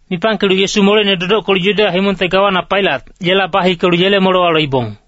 Mipangkelu Yesu moleine dodockelu Yudeya himongte gawana Pailat, yela bahikelu yele molewa loibong.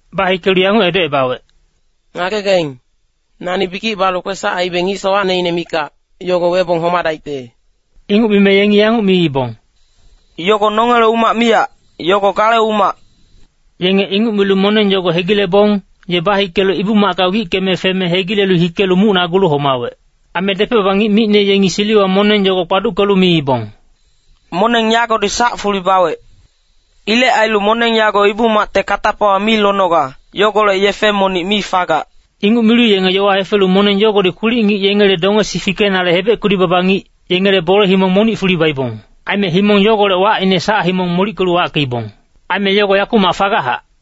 Bahikelu yanguc edocebawec, “Ngagegaing, nani bikic balu kwesac aibe ngic sowacneine mikac, yogo webong homadaicte.” Inguc mime yengi yanguc miibong, “Yogo nongele umac miyac, yogo gale umac.” Yenge inguc milu moneng yogo hegilebong, ye bahikelu Ibu-macka wickeme feme hegile hikelu mucnagulu homawec. Aime depec-baba ngic micne yengi siliwa moneng yogo kpaduckelu miibong, “Moneng yagodi sac fuli bawec. Ilec ailu moneng yago Ibu-macte katapawa mi lonoga, yogolec yefe monic mi fagac.” Inguc milu yenge yowa hefelu moneng yogodi kwilic-ngic yengele dongesi fikenale hebec kudi-baba ngic, yengele bole himong monic fuli baibong. Aime himong yogolec wacine Sac-himong molickelu wackeibong. Aime yogo yakumac fagachac.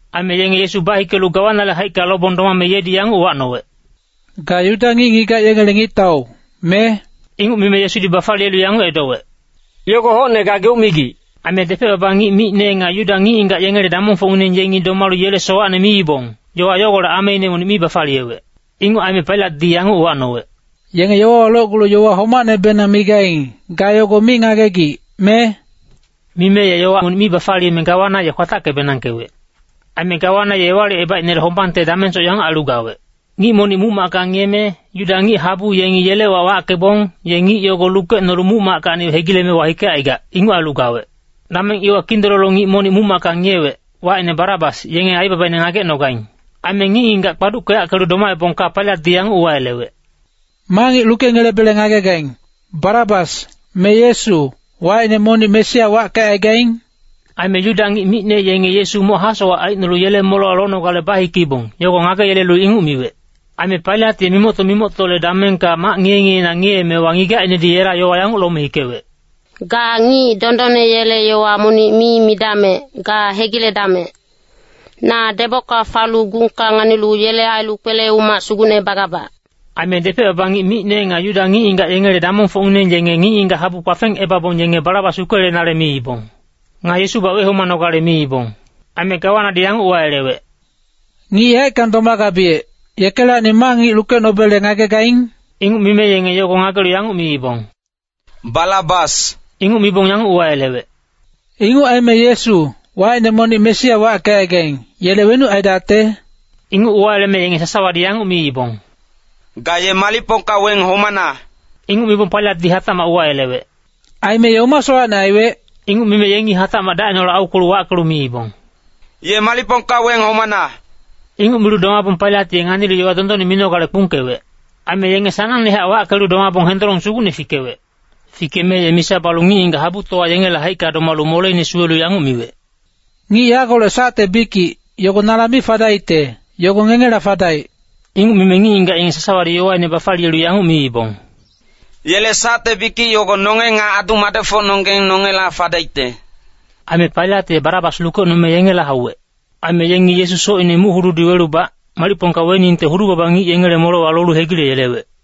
Aime yenge Yesu bahikelu gawanale haicka lobong domame yedi yanguc uwacnowec, “Ga Yuda ngic-ngigac yengele ngictau, me?” Inguc mime Yesudi bafaliyelu yanguc edowec, “Yogo hocne gageuc migic.” Aime depec-baba ngic micne nga Yuda ngic-ngigac yengele damongfocngineng yengi domalu yele sowacne miibong, yowa yogolec ameine monic mi bafaliyewec. Inguc aime Pailatdi yanguc uwacnowec, “Yenge yowawa locgulu yowa homacnebenang migaing, ga yogo mi ngagegic, me?” Mime ye yowa monic mi bafaliyeme gawana ye kwatacke-benangkewec. Aime gawana ye Ewalicebaicnele hombangte damengsoc yanguc ailu gawec. Ngic monic muc-macka ngiyeme, Yuda ngic-habu yengi yele wac wackebong, ye ngic yogo lukecnolu muc-mackacni hegileme wahikecaigac, inguc ailu gawec. Dameng iwa kindololo ngic monic muc-macka ngiyewec, wacine Barabas, yenge aibabaine ngagecnogaing. Aime ngic-ngigac kpaduckeyackelu domaebongka Pailatdi yanguc uwayelewec, “Ma ngic lukengelebele ngagegaing, Barabas, me Yesu, wacine monic Mesia wackecaigaing?” Aime Yuda ngic micne yenge Yesu moc hasowac aicnolu yele molewa lonogale bahikeibong, yogo ngageyelelu inguc miwec. Aime Pailat ye mimocto-mimoctole damengka mac ngiye-ngiyeina ngiyeemewa ngigacinedi yela yowa yanguc lome hikewec, “Ga ngic dondonne yele yowa monic mi midamec, ga hegiledamec. Na debocka falu gungka nganilu yele ailu kwele-umac sugucne bagabac.” Aime depec-baba ngic micne nga Yuda ngic-ngigac yengele damongfocngineng yenge ngic-ngigac habu kpafengebabong yenge Barabas lukeyelenale miibong. Nga Yesubac wehomanogale miibong. Aime gawanadi yanguc uwayelewec, “Ngic yaeckang domagabiyec, yekelacni ma ngic lukecnobele ngagegaing?” Inguc mime yenge yogo ngagelu yanguc miibong, “Barabas!” Inguc mibong yanguc uwayelewec, “Inguc aime Yesu, wacine monic Mesia wackecaigaing, yele wenuc aidacte?” Inguc uwayeleme yenge sasawadi yanguc miibong, “Ga ye malicpongka weng homana!” Inguc mibong Pailatdi hatacmac uwayelewec, “Aime ye oma sowacne aiwec?” Inguc mime yengi hatacmac dacineholec aukwelu wackelu miibong, “Ye malicpongka weng homana!” Inguc milu domabong Pailat ye nganilu yowa dondonne minogale kpungkewec. Aime yenge sanangnehac wackelu domabong hendolong sugucne fikewec. Fikeme ye misa balu ngic-ngigac habutowa yengele haicka domalu moleine suwelu yanguc miwec, “Ngic yagolec sacte bikic, yogo nala mi fadaicte, yogo ngengela fadaic.” Inguc mime ngic-ngigac yenge sasawadi yowaine bafaliyelu yanguc miibong, “Yele sacte bikic yogo nonge nga adu-madecfocnonggeng nongela fadaicte.” Aime Pailat ye Barabas lukecnome yengela hauwec. Aime yengi Yesu socine muc-hududi welubac, malicpongka weningte hudu-baba ngic yengele molewa lolu hegileyelewec.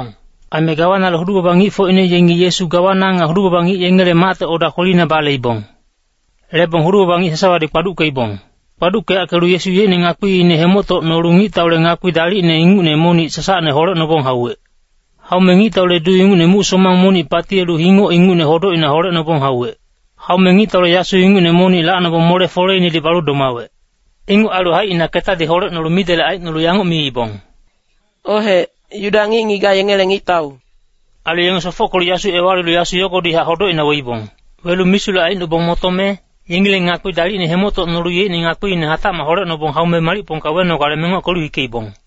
Aime gawanale hudu-baba ngicfocine yengi Yesu gawana nga hudu-baba ngic yengele macte oda kwelina baleibong. Lebong hudu-baba ngic sasawadi kpaduckeibong. Kpaduckeyackelu Yesu yeicne ngakpiine hemoctocnolu ngictaule ngakpi dalicne ingucne monic sasacne holecnobong hauwec. Haume ngictaule duu ingucne muc-somang monic patiyelu hingoc ingucne hodocina holecnobong hauwec. Haume ngictaule yasu ingucne monic lacnobong mole-foleinedi balu domawec. Inguc ailu haicina ketadi holecnolu midelec aicnolu yanguc miibong, “Ohec, Yuda ngic-ngigac yengele ngictau.” Ailu yenge sofockelu yasu ewalilu yasu yogodihac hodocina weibong. Welu misulec aicnobong motome, yengileng ngakpi dalicne hemoctocnolu yeicne ngakpiine hatacmac holecnobong haume malicpongka wenogale mengockelu hikeibong.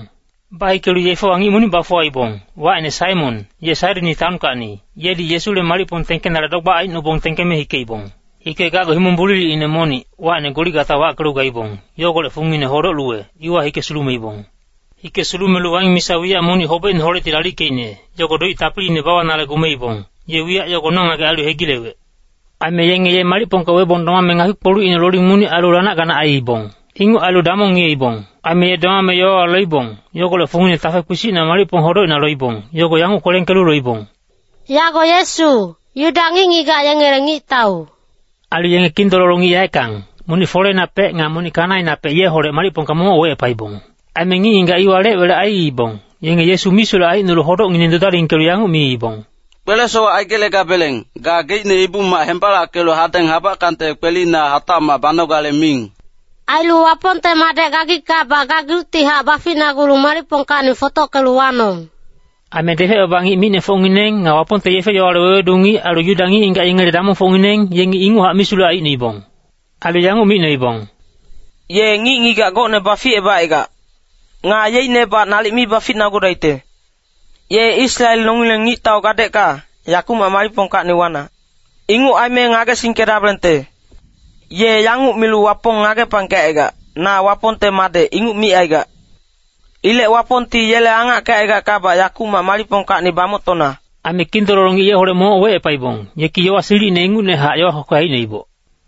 Bahikelu yefewa ngic monic bafuwaibong, wacine Saimon, ye Sairini taonkacni, yedi Yesule malicpong tengkenale dogbac aicnobong tengkeme hikeibong. Hikegacgu himong bulilicine monic, wacine Goligata wackelu gaibong, yogolec fungine Hodoc-luwe, iwa hike sulumeibong. Hike sulumelu waing misa wiyac monic hobecineholecti lalickeicne, yogo doic tapiliine bawanale gumebong, ye wiyac yogo nongagec ailu hegilewec. Aime yenge ye malicpongka webong domame ngakpi-kpolucine loling monic ailu lanac-ganac aiibong. Inguc ailu damong ngiyeibong. Aime ye domame yowawa loibong, yogolec fungine tafe kpisicna malicpong hodocina loibong, yogo yanguc kwelengkelu loibong, “Yago Yesu, Yuda ngic-ngigac yengele ngictau.” Ailu yenge kindololo ngic yaeckang, monic foleinapec nga monic kanainapec yeholec malicpongka momoc wecepaibong. Aime ngic-ngigac iwa lec-welec aiibong, yenge Yesu misulec aicnolu hodocngineng dudalingkelu yanguc miibong, “Kwele-sowac aigelegabeleng, gageicne Ibu-mac hembalackelu hadeng habackangte kwelina hatacmac banogale miing. Ailu Wapongte madec gagickabac gageuctihac baficnagulu malicpongkacni fotockelu wanong!” Aime depec-baba ngic micnefocngineng, nga Wapongte yefe-yowale wewedu ngic ailu Yuda ngic-ngigac yengele damongfocngineng, yengi inguchac misulec aicnoibong. Ailu yanguc micnoibong, “Ye ngic-ngigac gocne baficebacaigac. Nga yeicnebac nalic mi baficnagudaicte. Ye Israel nongileng ngictau gadecka, yakumac malicpongkacni wana. Inguc aime ngagesingkedabelengte! Ye yanguc milu Wapong ngagepangkecaigac, ‘Na Wapongte madec,’ inguc micaigac. Ilec Wapongti yele angackecaigackabac yakuc malicpongkacni bamoctona.” Aime kindololo ngic yeholec momoc wecepaibong, yeki yowa silicine ingucnehac yowa kwekwe aicnoiboc.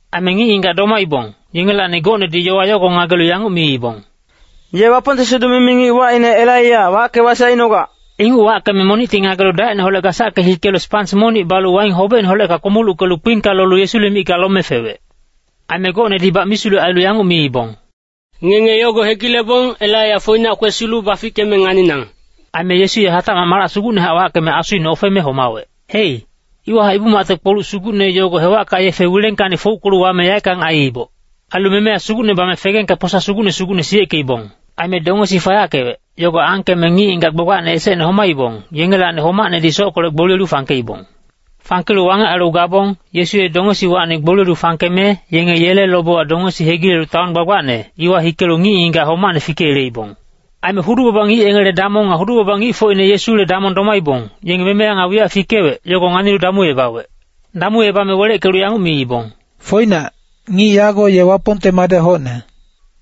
Aime ngic-ngigac domaibong, yengelacni gocnedi yowa yogo ngagelu yanguc miibong, “Ye Wapongte siduc-mimi ngic wacine Elaiya wacke-wasic aicnogac.” Inguc wackeme monicti ngagelu dacineholec gasacke hikelu spans monic balu waing hobecineholecka kpomuluckelu kpingka lolu Yesule micka lome fewec. Aime gocnedibac misulec ailu yanguc miibong, “Ngenge yogo hegilebong, Elaiya foinac kwesilu bafickeme nganinang.” Aime Yesu ye hatacmac malac sugucnehac wackeme asuine ofeme homawec. Hei, iwahac Ibu-macte kpoluc sugucne yogo hewacka yefe wilengkacni fouckelu wame yaeckang aiiboc. Ailu memeya sugucne bame fegengka posa sugucne sugucne siyeckeibong. Aime dongesi fayackewec, yogo angkeme ngic-ngigac gbagbacne esecne homaibong, yengelacni homacnedi sockolec gboliyelu fangkeibong. (Fangkelu wangec ailu gabong, Yesu ye dongesiwacni gboliyelu fangkeme, yenge yele lobewa dongesi hegilelu taon gbagbacne, iwa hikelu ngic-ngigac homacne fikeyeleibong.) Aime hudu-baba ngic yengele damong nga hudu-baba ngicfocine Yesule damong domaibong, yenge memeya nga wiyac fikewec, yogo nganilu damuebawec. Damuebame weleckelu yanguc miibong, “Foinac, ngic yago ye Wapongte madec hocne.”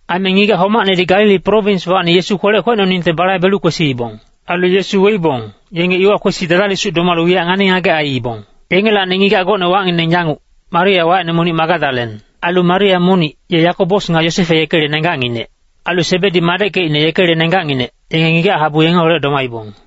Aime ngigac homacnedi Galili prowinswacni Yesu kwelec kwecnoningte balaibelu kwesiibong. Ailu Yesu weibong, yenge iwa kwesi dadalisuc domalu wiyac ngani-ngagec aiibong. Yengelacni ngigac gocne wacngineng yanguc, Maria wacine monic Magadalen. Ailu Maria monic, ye Yakobos nga Yosefe yekele nenggacnginec. Ailu Sebedi madeckecine yekele nenggacnginec, yenge ngigac habu yengeholec domaibong.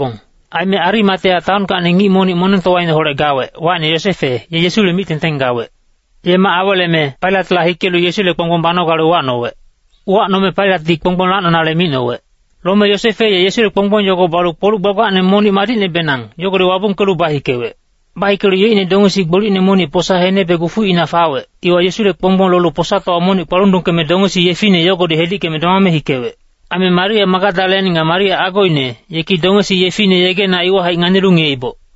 Aime Arimatea taonkacni ngic monic monengtowaineholec gawec, wacine Yosefe, ye Yesule mic-tengteng gawec. Ye mac aweleme Pailatla hikelu Yesule kponggbong banogale uwacnowec. Uwacnome Pailatdi kponggbong lacnonale micnowec. Lome Yosefe ye Yesule kponggbong yogo balu kpoluc gbagbacne monic madicnebenang, yogodi wabungkelu bahikewec. Bahikelu yeicne dongesi gbolicne monic posa henebe gufuicna fawec, iwa Yesule kponggbong lolu posatowa monic kpalundungkeme dongesi yefine yogodi hedickeme domame hikewec. Aime Maria Magadalen nga Maria agoine, yeki dongesi yefine yegena iwahaic nganilu ngiyeiboc.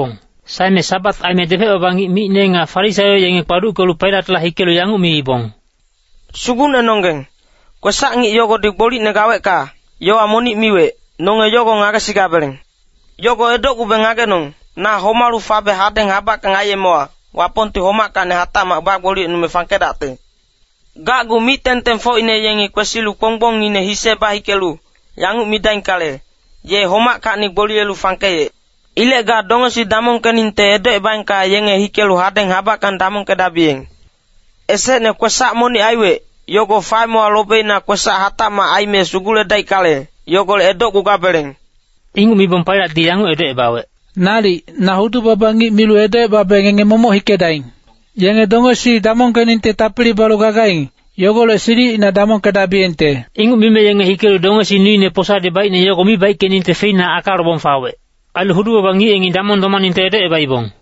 Saeme Sabat aime depec-baba ngic micne nga Farisaio yenge kpaduckelu Pailatla hikelu yanguc miibong, “Sugucnenonggeng, kwesac-ngic yogodi gbolicne gawecka, yowa monic miwec, nonge yogo ngagesigabeleng. Yogo edocgubeng ngagenong, ‘Na homalu fabe hadeng habackang aiyemewa, Wapongti homackacni hatacmac bagboliyecnume fangkedacte.’ Gacgu mic-tengtengfocine yengi kwesilu kponggbongine hise bahikelu, yanguc midaingkale, ‘Ye homackacni gboliyelu fangkeyec.’ Ilec ga dongesi damongkeningte edocebaengka yenge hikelu hadeng habackang damongkedabiyeng. Esecne kwesac monic aiwec, yogo faemewa lobeina kwesac hatacmac aime suguledaickale, yogolec edocgugabeleng.” Inguc mibong Pailatdi yanguc edocebawec, “Nalic, na hudu-baba ngic milu edocebabe ngenge momoc hikedaing. Yenge dongesi damongkeningte tapili balu gagaing, yogolec silicina damongkedabiyengte.” Inguc mime yenge hikelu dongesi nuine posadi baicne yogo mi baickeningte feina aka lobong fawec. Ailu hudu-baba ngic yengi damong domaningte edocebaibong.